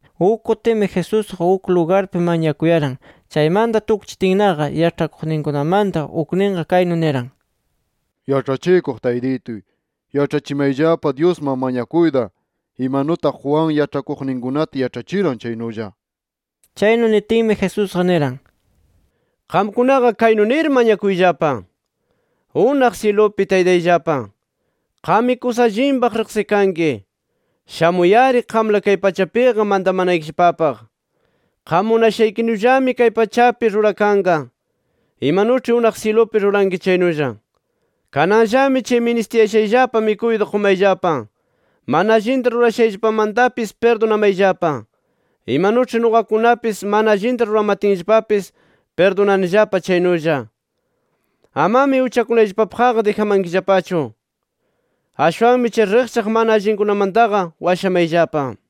Uk kutimi, Jesusqa uk lugarpi mañakuyaran. Chaymanta tukchitinnaqa yaĉhakuqninkunamanta ukninqa kaynu niran: —Yaĉhachikuq Taytituy, yaĉhachimayllapa Dyusman mañakuyta, imanutaq Juan yaĉhakuqninkunata yaĉhachiran chaynulla. Chaynu nitinmi, Jesusqa niran: —Qamkunaqa kaynu nir mañakuyllapa: ‘[Unaq syilupi] Taytayllapa, qammi kusa allinpaq riqsikanki. Shamuy-ari qamla kay pachapiqa mantamanaykillapapaq. [Qam munashaykinullami kay pachapi rurakanqa imanuĉhi unaq syilupi ruranki chaynulla]. Kananllami chay ministiyashayllapa mikuyta qumayllapa. Mana allinta rurashayllapamantapis pirdunamayllapa, imanuĉhi nuqakunapis mana allinta ruramatinllapapis pirdunanillapa chaynulla. Amami uchakunayllapapaqqa dijamankillapachu. [Ashwanmi chay riqchaq mana allinkunamantaqa washamayllapa]’.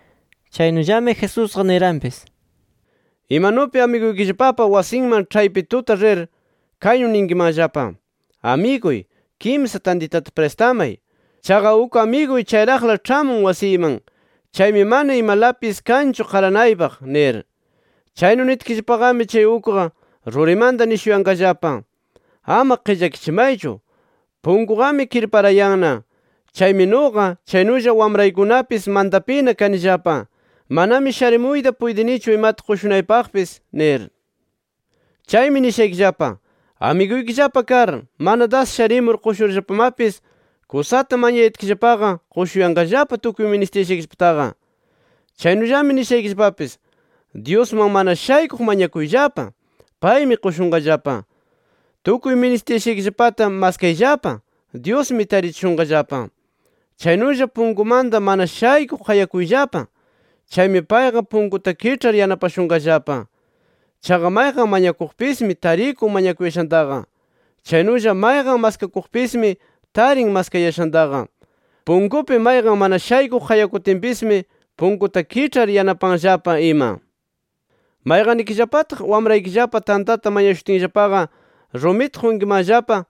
Chaynullami Jesusqa niranpis: “Imanupi amiguykillapapa wasinman ĉhaypi tuta rir, kaynu ninkimanllapa: ‘Amiguy kimsa tantitata pristamay. Chaqa uk amiguy chayraqla ĉhamun wasiyman. Chaymi mana imalapis kanchu qaranaypaq’ nir. “Chaynu nitkillapaqami, chay ukqa rurimanta nishuyanqallapa: ‘Ama qillakachimaychu, punkuqami kirparayanna. Chaymi nuqa, chaynulla wamraykunapis mantapina kanillapa. Manami sharimuyta puytinichu imata qushunaypaqpis’ nir. Chaymi nishaykillapa: Amiguykillapa kar, mana das sharimur qushurllapamapis, kusata mañayatkillapaqa qushuyanqallapa tukuy ministishaykillapataqa. “Chaynullami nishaykillapapis: Dyusman mana shaykuq mañakuyllapa; paymi qushunqallapa. Tukuy ministishaykillapata maskayllapa; Dyusmi tarichishunqallapa. Chaynulla punkumanta mana shaykuq qayakuyllapa; chaymi payqa punkunta kiĉhar yanapashunqallapa. Chaqa mayqan mañakuqpismi tarikun mañakuyashantaqa. Chaynulla mayqan maskakuqpismi, tarin maskayashantaqa. Punkupi mayqan mana shaykuq qayakutinpismi, punkunta kiĉhar yanapanllapa ima. “¿Mayqannikillapataq, wamraykillapa [tantata mañashutinllapaqa rumita qunkimanllapa,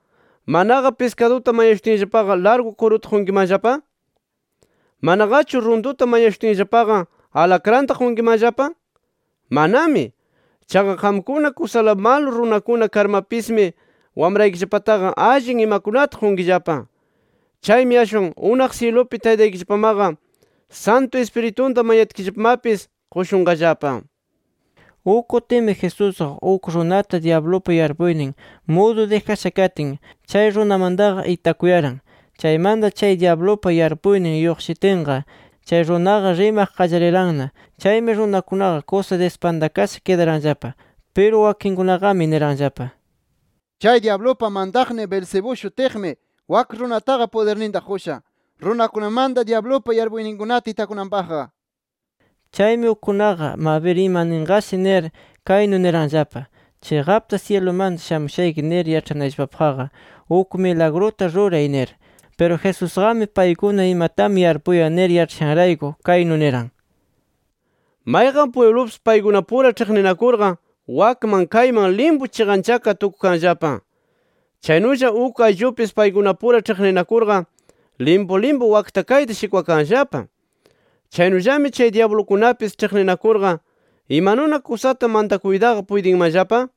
manaqa] piskaduta mañashutinllapaqa, largu kuruta qunkimanllapa? ¿Manaqachu runtuta mañashutinllapaqa, alakranta qunkimanllapa? ¡Manami! Chaqa qamkuna kusala malu runakuna karmapismi, wamraykillapataqa allin imakunata qunkillapa. Chaymi ashwan ¡unaq syilupi Taytaykillapamaqa, Santu Ispiritunta mañatkillapamapis qushunqallapa!” Uk kutimi Jesusqa, uk runata dyablupa yarpuynin mudu dijasha katin, chay runamantaqa itakuyaran. Chaymanta chay dyablupa yarpuynin lluqshitinqa, chay runaqa rimaq qallariranna. Chaymi runakunaqa kusa dispantakasha kidaranllapa. Piru wakinkunaqami niranllapa: “Chay dyablupa mantaqnin Beelzebú shutiqmi, wak runataqa pudirninta qusha runakunamanta dyablupa yarpuyninkunata itakunanpaqqa” nir. Chaymi ukkunaqa mabir ima ninqashi nir, kaynu niranllapa: “Chiqapta syilumanta shamushayki nir yaĉhanayllapapaqqa uk milagruta ruray” nir. Piru Jesusqami, paykuna imatami yarpuyan nir yaĉhashanrayku kaynu niran: “Mayqan pwiblupis paykunapura ĉhiqninakurqa wakman kayman limpu chiqanchakar tukukanllapa. Chaynulla uk ayllupis paykunapura ĉhiqninakurqa limpu limpu wakta kayta shikwakanllapa. Chaynullami, chay dyablukunapis ĉhiqninakurqa ¿imanuna kusata mantakuytaqa puytinmanllapa?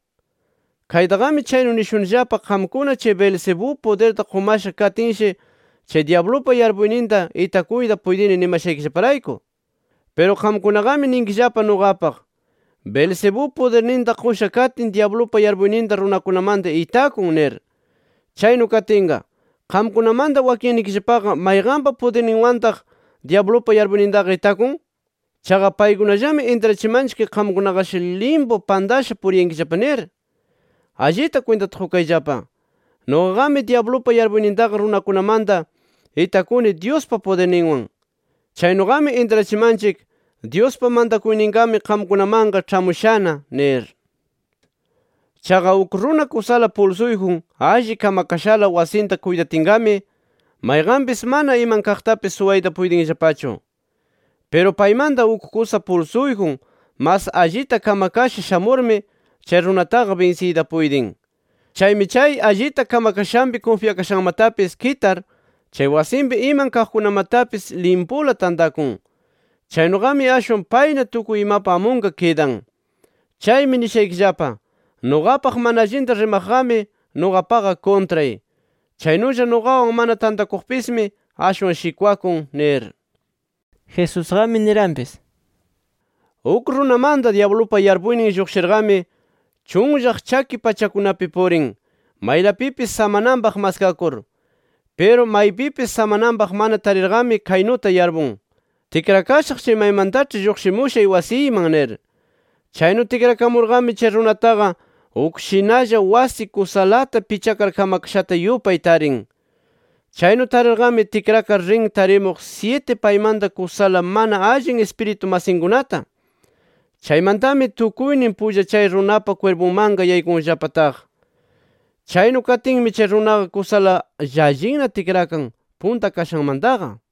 Kaytaqami chaynu nishunillapa, qamkuna chay Beelzebú pudirta qumasha katinshi chay dyablupa yarpuyninta itakuyta puytini nimashaykillaparayku. Piru qamkunaqami ninkillapa nuqapaq: ‘Beelzebú pudirninta qusha katin dyablupa yarpuyninta runakunamanta itakun’ nir. Chaynu katinqa, ¿qamkunamanta wakinnikillapaqa mayqanpa pudirninwantaq dyablupa yarpuynintaqa itakun? Chaqa paykunallami intrachimanchik qamkunaqashi limpu pantasha puriyankillapa nir. Allita kwintata qukayllapa: Nuqaqami dyablupa yarpuynintaqa runakunamanta itakuni Dyuspa pudirninwan. Chaynuqami intrachimanchik, Dyuspa mantakuyninqami qamkunamanqa ĉhamushana nir. “Chaqa uk runa kusala pulsuyjun alli kamakashala wasinta kuytatinqami, mayqanpis mana iman kaqtapis suwayta puytinllapachu. Piru paymanta uk kusa pulsuyjun mas allita kamakasha shamurmi chay runataqa binsiyta puytin. Chaymi chay allita kamakashanpi kunfyakayashanmatapis kitar, chay wasinpi iman kaqkunamatapis limpula tantakun. Chaynuqami ashwan payna tukuy imapa amunqa kidan. “Chaymi nishaykillapa: Nuqapaq mana allinta rimaqqami nuqapaqa kuntray. Chaynulla nuqawan mana tantakuqpismi ashwan shikwakun nir”. Jesusqami niranpis: “Uk runamanta dyablupa yarpuynin lluqshirqami, chunllaq chaki pachakunapi purin, maylapipis samananpaq maskakur. Piru maypipis samananpaq mana tarirqami kaynuta yarpun: Tikrakashaq chay maymantaĉhi lluqshimushay wasiyman nir. Chaynu tikrakamurqami, chay runataqa uk shinalla wasi kusalata pichakar kamakashata yupay tarin. Chaynu tarirqami tikrakar rin tarimuq syiti paymanta kusala mana allin ispiritu masinkunata. Chaymantami tukuynin pulla chay runapa kwirpunmanqa yaykunllapa taq. Chaynu katinmi chay runaqa kusala llallinna tikrakan, punta kashanmantaqa” nir.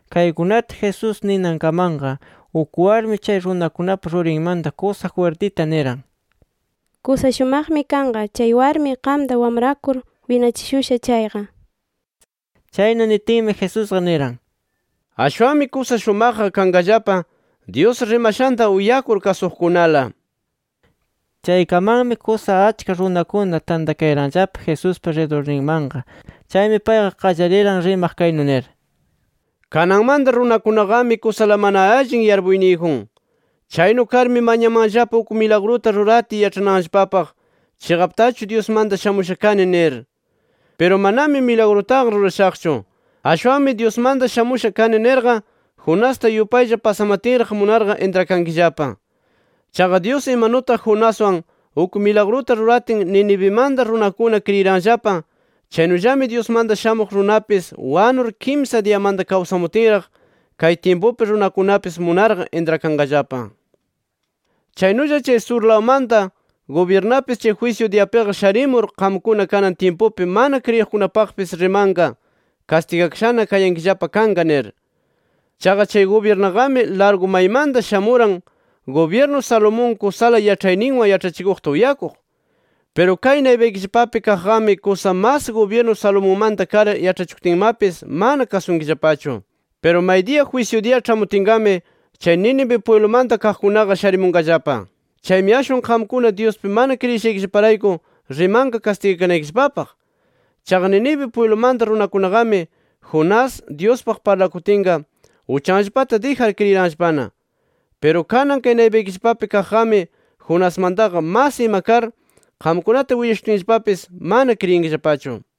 Kaykunata Jesús ninankamanqa, uk warmi chay runakunapa rurinmanta kusa jwirtita niran: —¡Kusa shumaqmi kanqa chay warmi qamta wamrakur winachishusha chayqa! Chaynu nitinmi Jesusqa niran: —¡Ashwanmi kusa shumaqqa kanqallapa, Dyus rimashanta uyakur, kasuqkunala! nir. Chaykamanmi, kusa achka runakuna tantakayaranllapa Jesuspa ridurninmanqa. Chaymi payqa qallariran rimaq kaynu nir: “Kananmanta runakunaqami kusala mana allin yarpuyniyjun. Chaynu karmi mañamanllapa uk milagruta ruratiy yaĉhananllapapaq chiqaptachu Dyusmanta shamusha kani nir. Piru manami milagrutaqa rurashaqchu. Ashwanmi Dyusmanta shamusha kani nirqa Jonasta yupaylla pasamatinraq munarqa intrakankillapa. Chaqa Dyus imanutaq Jonaswan uk milagruta ruratin Ninivimanta runakuna kriyiranllapa, chaynullami Dyusmanta Shamuq Runapis wanur kimsa diyamanta kawsamutinraq kay tyimpupi runakunapis munarqa intrakanqallapa. “Chaynulla chay surlawmanta gubyirnapis chay jwisyu diyapiqa sharimur, qamkuna kanan tyimpupi mana kriyinaqkunapaqpis rimanqa kastigakashana kayankillapa kanqa nir. Chaqa chay gubyirnaqami largu maymanta shamuran, gubyirnu Salomón kusala yaĉhayninwan yaĉhachikuqta uyakuq. Piru kay naypaykillapapi kaqqami kusa mas gubyirnu Salomonmanta kar yaĉhachikutinmapis mana kasunkillapachu. “Piru maydiya jwisyu diya ĉhamutinqami chay Nínive pwiblumanta kaqkunaqa sharimunqallapa. Chaymi ashwan qamkuna Dyuspi mana kriyishaykillaparayku rimanqa kastigakanaykillapapaq. Chaqa Nínive pwiblumanta runakunaqami Jonás, Dyuspaq parlakutinqa uchanllapata dijar kriyiranllapana. Piru kanan kay naypaykillapapi kaqqami Jonasmantaqa mas ima kar, qamkunata willashutinllapapis mana kriyinkillapachu.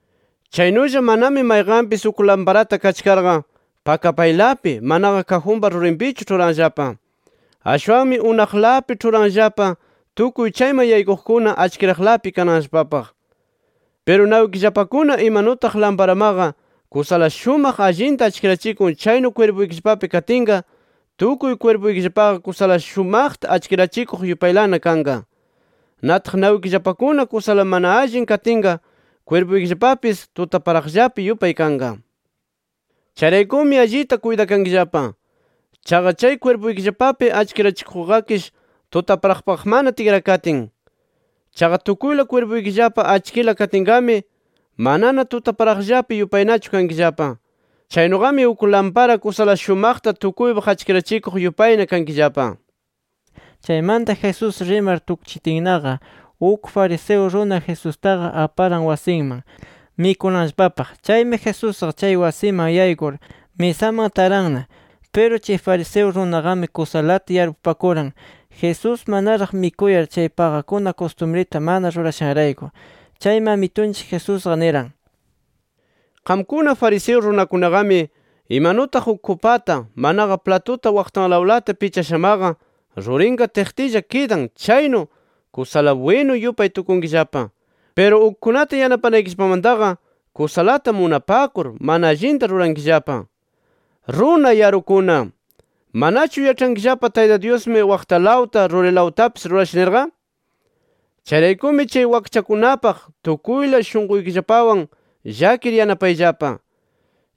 “Chaynulla manami mayqanpis uk lamparata kachkarqa pakapaylapi, manaqa kajunpa rurinpichu ĉhuranllapa. Ashwanmi unaqlapi ĉhuranllapa, tukuy chayman yaykuqkuna achkiraqlapi kananllapapaq. Piru nawikillapakuna imanutaq lamparamaqa kusala shumaq allinta achkirachikun chaynu kwirpuykillapapi katinqa, tukuy kwirpuykillapaqa kusala shumaqta achkirachikuq yupaylana kanqa. Nataq nawikillapakuna kusala mana allin katinqa, kwirpuykillapapis tutaparaqllapi yupay kanqa. Chayraykumi allita kuytakankillapa. Chaqa chay kwirpuykillapapi achkirachikuqqakish tutaparaqpaqmana tikrakatin. Chaqa tukuyla kwirpuykillapa achkila katinqami, manana tutaparaqllapi yupaynachu kankillapa. Chaynuqami uk lampara kusala shumaqta tukuypaq achkirachikuq yupayna kankillapa”. Chaymanta Jesús rimar tukchitinnaqa uk fariseo runa, Jesustaqa aparan wasinman mikunanllapapaq. Chaymi Jesusqa chay wasiman yaykur, misaman taranna. Piru chay fariseo runaqami kusalata yarpupakuran, Jesús manaraq mikuyar chay paqakuna kustumrita mana rurashanrayku. Chaymi Amitunchik Jesusqa niran: —Qamkuna fariseo runakunaqami, imanutaq uk kupata, manaqa platuta waqtanlawlata pichashamaqa rurinqa tiqtilla kidan chaynu, kusala bwinu yupay tukunkillapa. Piru ukkunata yanapanaykillapamantaqa kusalata munapakur, mana allinta rurankillapa. ¡Runa yarukuna! ¿Manachu yaĉhankillapa, Tayta Dyusmi waqtalawta, rurilawtapis rurasha nirqa? Chayraykumi chay wakchakunapaq tukuyla shunquykillapawan llakir, yanapayllapa.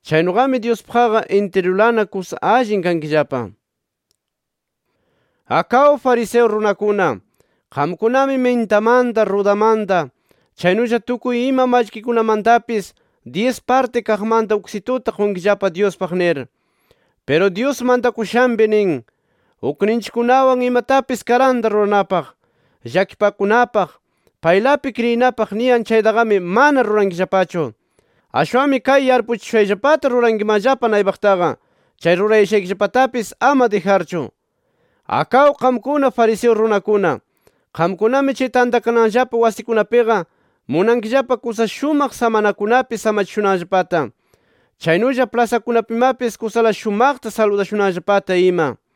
Chaynuqami Dyuspaqqa intirulana kusa allin kankillapa. “¡Akaw fariseo runakuna! Qamkunami mintamanta, rudamanta, chaynulla tukuy ima mallkikunamantapis, dyis partin kaqmanta uksituta qunkillapa Dyuspaq nir. Piru Dyus mantakushanpi nin: Ukninchikkunawan imatapis karanta ruranapaq, llakipakunapaq, paylapi kriyinapaq niyan chaytaqami mana rurankillapachu. Ashwanmi kay yarpuchishushayllapata rurankimanllapa naypaqtaqa, chay rurayashaykillapatapis ama dijarchu. “¡Akaw qamkuna fariseo runakuna! Qamkunami chay tantakananllapa wasikunapiqa, munankillapa kusa shumaq samanakunapi samachishunanllapata, chaynulla plasakunapimapis kusala shumaqta saludashunanllapata ima.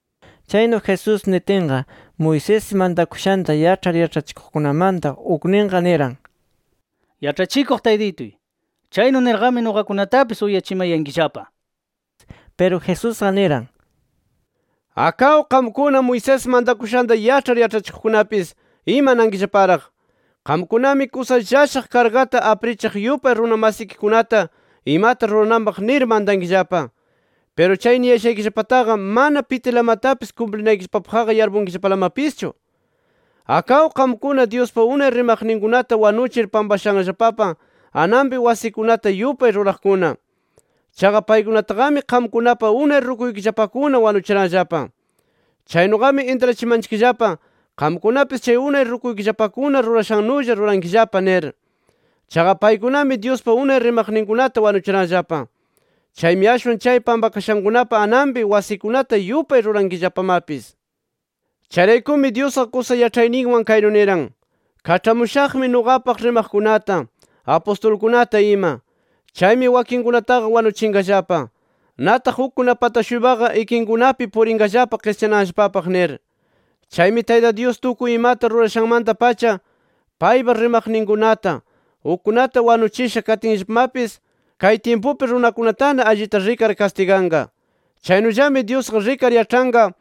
Chaynu Jesús nitinqa, Moisés mantakushanta yaĉhar yaĉhachikuqkunamanta ukninqa niran: —Yaĉhachikuq Taytituy, chaynu nirqami nuqakunatapis uyachimayankillapa nir. Piru Jesusqa niran: —¡Akaw qamkuna Moisés mantakushanta yaĉhar yaĉhachikuqkunapis, imanankillaparaq! Qamkunami kusa llashaq kargata aprichiq yupay runa masikikunata imata rurananpaq nir mantankillapa. Piru chay niyashaykillapataqa mana pitilamatapis kumplinaykillapapaqqa yarpunkillapalamapischu. “¡Akaw qamkuna, Dyuspa unay rimaqninkunata wanuchir pampashanllapapa ananpi wasikunata yupay ruraqkuna! Chaqa paykunataqami qamkunapa unay rukuykillapakuna wanuchiranllapa. Chaynuqami intrachimanchikllapa, qamkunapis chay unay rukuykillapakuna rurashannulla rurankillapa nir. Chaqa paykunami Dyuspa unay rimaqninkunata wanuchiranllapa. Chaymi ashwan chay pampakashankunapa ananpi wasikunata yupay rurankillapamapis. “Chayraykumi Dyusqa kusa yaĉhayninwan kaynu niran: ‘Kaĉhamushaqmi nuqapaq rimaqkunata, apustulkunata ima. Chaymi wakinkunataqa wanuchinqallapa. Nataq ukkunapata-shuypaqa ikinkunapi purinqallapa qischananllapapaq’ nir. Chaymi Tayta Dyus tukuy imata rurashanmanta-pacha paypa rimaqninkunata, ukkuna wanuchisha katinllapamapis, kay tyimpupi runakunatana allita rikar kastiganqa. Chaynullami Dyusqa rikar yaĉhanqa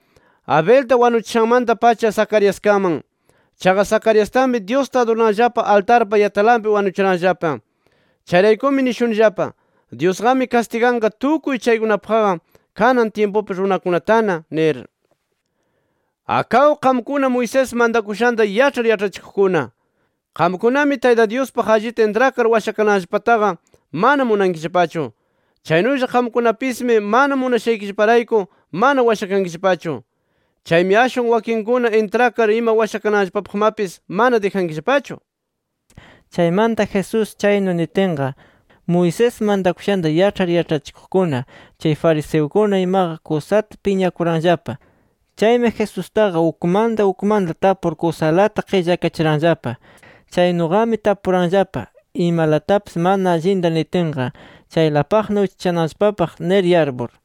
Abelta wanuchishanmanta-pacha Zacariaskaman. Chaqa Zacariastami, Dyusta adurananllapa altarpa yatalanpi wanuchiranllapa. Chayraykumi nishunillapa: Dyusqami kastiganqa tukuy chaykunapaqqa, kanan tyimpupi runakunatana nir. “¡Akaw, qamkuna Moisés mantakushanta yaĉhar yaĉhachikuqkuna! Qamkunami Tayta Dyuspaq allita intrakar washakananllapataqa mana munankillapachu. Chaynulla qamkunapismi mana munashaykillaparayku mana washakankillapachu. Chaymi ashwan wakinkuna intrakar ima washakananllapapaqmapis mana dijankillapachu”. Chaymanta Jesús chaynu nitinqa, Moisés mantakushanta yaĉhar yaĉhachikuqkuna, chay fariseukuna imaqa, kusata piñakuranllapa. Chaymi Jesustaqa ukmanta ukmanta tapur, kusalata qillakachiranllapa. Chaynuqami tapuranllapa imalatapis mana allinta nitinqa, chaylapaq uchachananllapapaq nir yarpur.